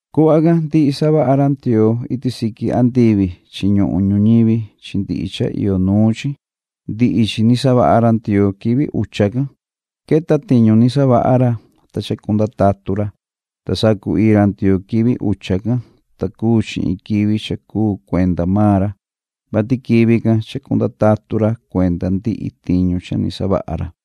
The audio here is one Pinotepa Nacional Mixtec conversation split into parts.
Cuhva can ndihi savaha ra Ndioo iti siqui andivi chi ñuhun ñuñivi chi ndihi cha iyo nuun chi. Ndihi chi ni savaha ra Ndioo quivi ucha can. Queta tiñu ni savaha ra, ta chacunda tatu ra. Ta sacu-ii ra Ndioo quivi ucha can, ta cuu chi in quivi cha cuu cuenda maan ra, vati quivi can chacunda tatu ra cuenda ndihi tiñu cha ni savaha ra.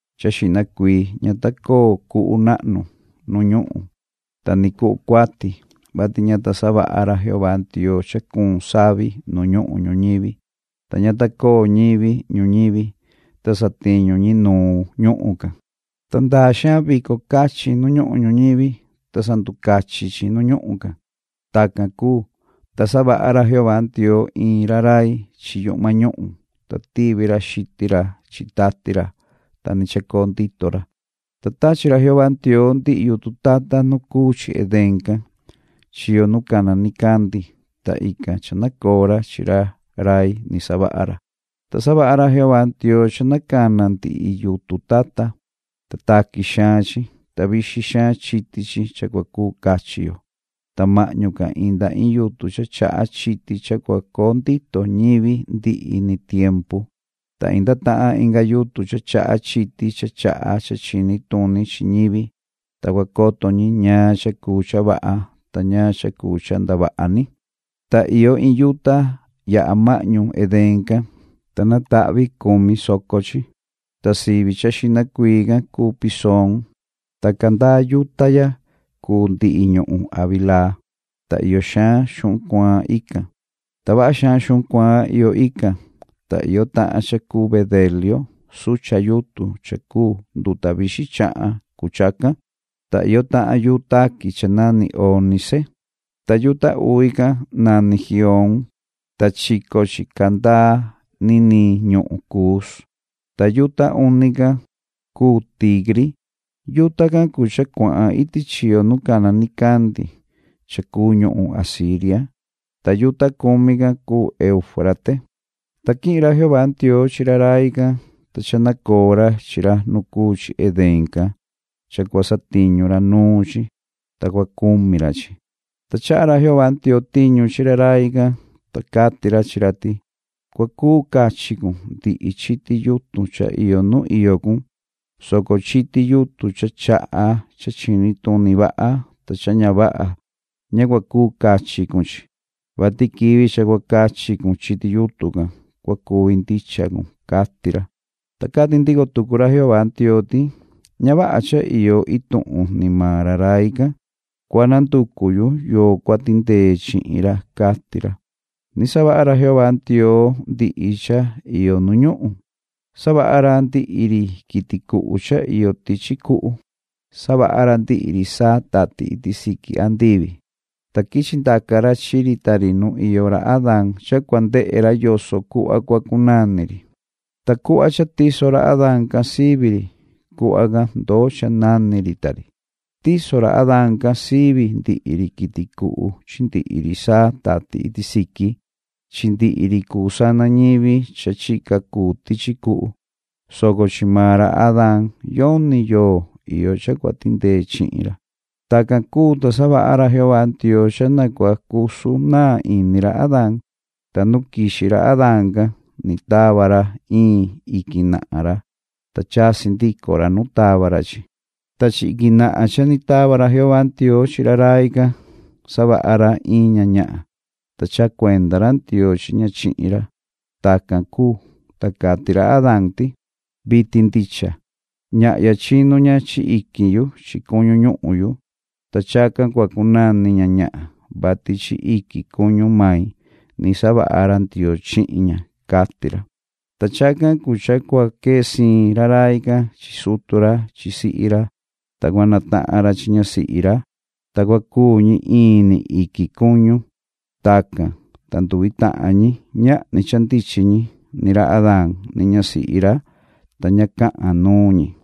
cha xihna cuii ña ta coo cuhu nahnu nu ñuhun, ta ni cuhu cuati ña ta coo, vati ña ta savaha ra Jehová Ndioo cha cuun savi nu ñuhun ñuñivi, ta ña ta coo ñivi ñuñivi, ta satiñu ñi nu ñuhun can. Ta ndaa xaan vico cachi nu ñuhun ñuñivi, ta sanducachin chi nu ñuhun can. Tacan cuu, ta savaha ra Jehová Ndioo in ra rai chi yuhma ñuhun, ta tivi ra xitin ra chi tati ra, ta ni chacoo ndito ra. Ta tachi ra Jehová Ndioo ndihi yutun tata nu cuu chi Edén can, chiyo nu cana nicandi, ta ican cha nacoo ra chi ra rai ni savaha ra. Ta savaha ra Jehová Ndioo cha na cana ndihi yutun tata. Ta taqui xaan chi, ta vixin xaan chiti chi cha cua cuu cachi yo. Ta mahñu can inda in yutun cha chaha chiti cha cua coo ndito ñivi ndihi ni tiempu. Ta inda tahan inga yutun cha chaha chiti cha chaha cha chini tuni chi ñivi, ta cua coto ñi ñaan cha cuu cha vaha ta ñaan cha cuu cha ndavaha ni. Ta iyo in yuta yaha mahñu Edén can, ta natahvi cumi soco chi. Ta sivi cha xihna cuii can cuu Pisoon ta candaa yuta ya cuu ndihi ñuhun Havilaa, ta iyo xaan xuhun cuaan ican. Ta vaha xaan xuhun cuaan iyo ican, ta iyo tahan cha cuu bedelio sucha yutun cha cuu nduta vixin chahan cuu chacan, ta iyo tahan yuu taqui cha nani ónice. Ta yuta uvi can nani Gihoon, ta chico chi candaa niniin ñuhun Cuus. Ta yuta uni can cuu Tigri. Yuta can cuu cha cuahan iti chiyo nu cana nicandi cha cuu ñuhun Asiria, ta yuta cumi can cuu Euufrate. Ta quihin ra Jehová Ndioo chi ra rai can, ta cha nacoo ra chi ra nu cuu chi Edén can cha cua satiñu ra nuun chi, ta cua cumi ra chi. Ta tava tiñu ra Jehová Ndioo chi ra rai can, ta cati ra chi ra ti: “Cua cuu cachi cun ndihi chiti yutun cha iyo nu iyo cun, soco chiti yutun cha chaha cha chini tuni vaha ta cha ña vaha ña cua cuu cachi cun chi, vati quivi cha cua cachi cun chiti yutun can, cua cuvi ndicha cun”, cati ra. Ta cati ndico tucu ra Jehová Ndioo ti: “Ña vaha cha iyo ituhun ni maan ra rai can. Cua na nducu yu yoo cua tindee chihin ra”, cati ra. Ni savaha ra Jehová Ndioo ndihi cha iyo nu ñuhun, savaha ra ndihi ri quiti cuhu cha iyo tichi cuhu, savaha ra ndihi ri saa tati iti siqui andivi, ta quichi ndaca ra chi ri ta ri nu iyo ra Adaan cha cua ndehe ra yoso cuhva cua cunani ri. Ta cuhva cha tiso ra Adaan can sivi ri, cuhva can ndoo cha nani ri ta ri. Tiso ra Adaan can sivi ndihi ri quiti cuhu chi ndihi ri saa tati iti siqui chi ndihi ri cuu sana ñivi cha chica cuu tichi cuhu, soco chi maan ra Adaan yoni yoo iyo cha cua tindee chihin ra. Tacan cuu, ta savaha ra Jehová Ndioo cha na cua cusu naan ini ra Adaan, ta nu quixi ra Adaan can ni tava ra in iquin nahan ra, ta chasi ndico ra nu tava ra chi chi. Ta chi iquin nahan cha ni tava ra Jehová Ndioo chi ra rai can savaha ra in ña ñahan, ta chaha cuenda ra Ndioo chi ña chihin ra. Tacan cuu, ta cati ra Adaan ti: “Vitin ndicha, ñahya chinu ña chi iquin yu chi cuñu ñuhun yu, ta chacan cua cunani ña ‘ñahan’, vati chi iquin cuñu main ni savaha ra Ndioo chihin ña”, cati ra. Ta chacan cuu cha cua quee siin ra rai can chi sutu ra chi sihi ra, ta cua natahan ra chi ñasihi ra, ta cua cuu ñi in ni iquin cuñu. Tacan, ta nduvi tahan ñi ñahni cha ndichin ñi, ni ra Adaan ni ñasihi ra, ta ña cahan nuun ñi.